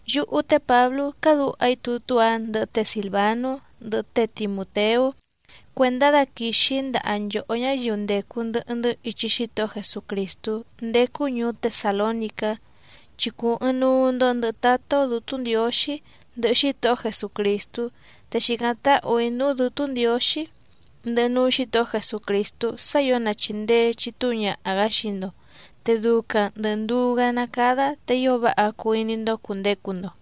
Yúhú té Pǎblú cádǔha‑í tutú‑a ndɨhɨ té Sìlvanú, ndɨhɨ té Timùteú cuèndá daquìxi‑í ndaha nchòhó ñáyiu ndècu ndɨhɨ‑ndɨ́ ichi Xítohó Jesucrìstú ndécú ñùú Tesàlónicá, chi cùu ɨɨⁿnuu‑ndo ndɨhɨ Tátá‑ó Dǔtú Ndiǒxí, ndɨhɨ Xítohó Jesucrìstú. Te xìcáⁿ táhù‑í núú Dǔtú Ndiǒxí, ndɨhɨ núú Xǐtohó Jesucrìstú sá ǐo na chìndee chitúu ñaha‑gǎ xii‑ndo, te ducaⁿ ndɨ̀ nduú‑gá ná càda te ío váha cuu iní‑ndó cùndecu‑ndo.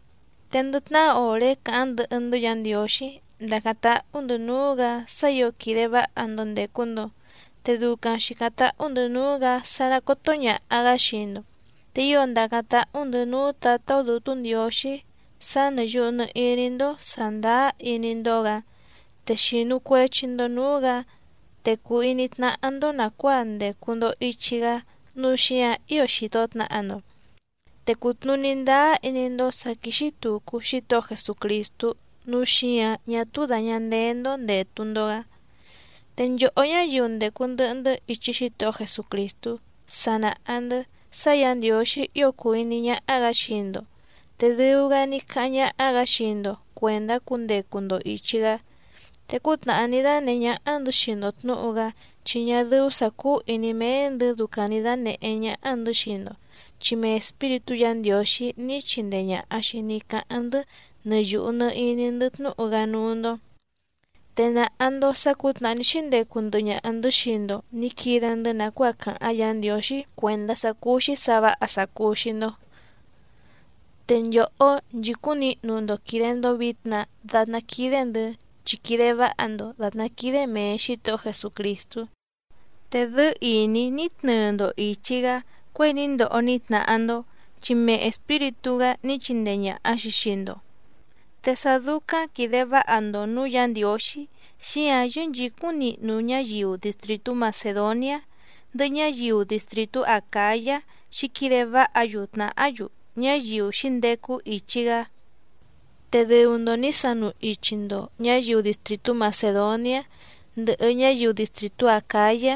Te ndɨ tnahá òré càháⁿ ndɨhɨ‑ndɨ́ Yǎ Ndiǒxí ndàcáⁿ táhú‑ndɨ̌ núú‑gǎ sá ǐo quìde váha‑ndo ndècu‑ndo, te ducaⁿ xìcáⁿ táhú‑ndɨ̌ núú‑gǎ sá ná còto ñaha‑gá xii‑ndo. Te ío ndàcáⁿ táhú‑ndɨ̌ núú Tǎtá‑ó Dǔtú Ndiǒxí sá nɨ̀ yuhu nɨ iní‑ndó sàndáá iní‑ndó‑gǎ, te xìnu cuechi‑ndo núú‑gǎ, te cùu iní tnáhá‑ndó nàcuáa ndècu‑ndo ichi‑gá nǔu xíǎⁿ ío xìto tnaha‑ndo. Te cùtnuní ndáá iní‑ndó sǎ quíxí tùcu Xítohó Jesucrìstú nǔu xíǎⁿ ñá túú dàña ndeé‑ndó ndètu‑ndo‑gá. Te nchòhó ñáyiu ndècu ndɨhɨ‑ndɨ́ ichi Xítohó Jesucrìstú sa nàha‑ndɨ́ sá Yǎ Ndiǒxí ío cùu iní ñáhá‑gǎ xii‑ndo, te dɨu‑gá ní cáháⁿ ñáhá‑gǎ xii‑ndo cuèndá cundecu‑ndo ìchi‑gá. Te cútnàhá ní dánèhé ñáhá‑ndɨ̌ xii‑ndo tnǔhu‑gá, chi ñá dɨ́ú sǎ cúú ìní méé‑ndɨ̌ ducaⁿ nǐ dànehé ñáhá‑ndɨ̌ xii‑ndo, chi mee Espíritú Yǎ Ndiǒxí ní chindee ñàha‑xi ní cáháⁿ‑ndɨ́ nɨ yùhu nɨ iní‑ndɨ́ tnúhu‑gá núú‑ndó. Te nàha‑ndo sá cǔtnàhá ní xíndecu ndɨhɨ ñaha‑ndɨ̌ xii‑ndo nǐ quide‑ndɨ́ nàcuáa càháⁿ Yǎ Ndiǒxí cuèndá sá cúú‑xí sǎ vǎha sá cúú‑xí‑ndó. Te nchòhó nchìcúⁿ nihnu‑ndo quìde‑ndo vitna datná quídé‑ndɨ̌, chi quìde váha‑ndo dàtná quídé mèe Xítohó Jesucrìstú, te dɨ́ɨ́ ìní ní tnɨɨ‑ndo ìchi‑gá cuěi ní ndoho ní tnahá‑ndó, chi mee Espíritú‑gá ní chindee ñàha‑xi xii‑ndo. Te sá dúcáⁿ quìde váha‑ndo nǔú Yǎ Ndiǒxí, xíǎⁿ yɨ́nchǐcúⁿ nihnu ñáyiu distrìtú Macèdoniá, ndɨhɨ ñáyiu distrìtú Acǎyá xǐquide váha‑yu tnàhá‑yu, ñáyiu xǐndecu ichi‑gá. Te dɨu‑ndo nǐ sanu ichi‑ndo ñǎyiu distrìtú Macèdoniá, ndɨhɨ ñáyiu distrìtú Acǎyá,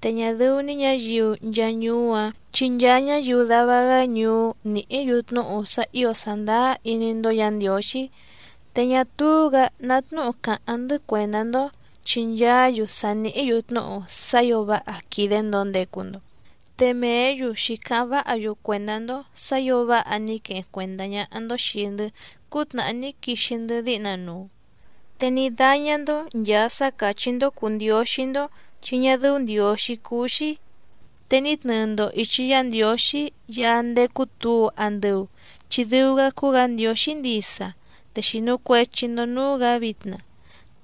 te ñá dɨ́ú‑ní ñǎyiu nchaa ñuú‑áⁿ chi nchaa ñáyiu dava‑gá ñuú nìhí‑yu tnúhu sá ǐo sàndáá iní‑ndó Yǎ Ndiǒxí. Te ñá túú‑gǎ ná tnúhu cáháⁿ‑ndɨ́ cuèndá‑ndó, chi nchaá‑yu sa nìhí‑yu tnúhu sá ǐo váha quìde‑ndo ndecu‑ndo. Te mèé‑yu xǐcáháⁿ váha‑yu cuèndá‑ndó sǎ ǐo váha ní queheⁿ cuèndá ñáhá‑ndó xìi‑ndɨ́ cútnàhá ní quixi‑ndɨ́ díhna nuu. Te ní dáñá‑ndó nchàa sá càchí‑ndó cùu ndióxí‑ndó chi ñá dɨ́ú ndiǒxí cúú‑xí, te ní tnɨɨ‑ndo ìchi Yá Ndiǒxí Yaá ndécú tǔu andɨu chi dɨu‑gá cúú‑gǎ Ndiǒxí ndisa, te xìnu cuechi‑ndo núú‑gǎ vitna,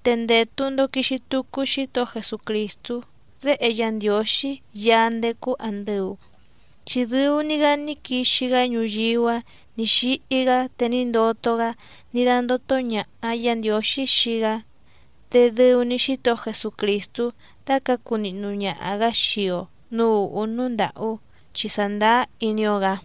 te ndètu‑ndo quixi tucu Xítohó Jesucrìstú Déhe Yá Ndiǒxí Yaá ndécú àndɨu, chi dɨu‑ni‑gá ní quixi‑gá ñuyíú‑a ní xíhí‑gá, te ní ndoto‑gá ní dándótó ñàha Yá Ndiǒxí xii‑gá. Te dɨu‑ni Xítohó Jesucrìstú dácǎcu nihnu ñaha‑gǎ xii‑o nǔú ùhú núú ndàhú, chi sàndáá iní‑ó‑gǎ.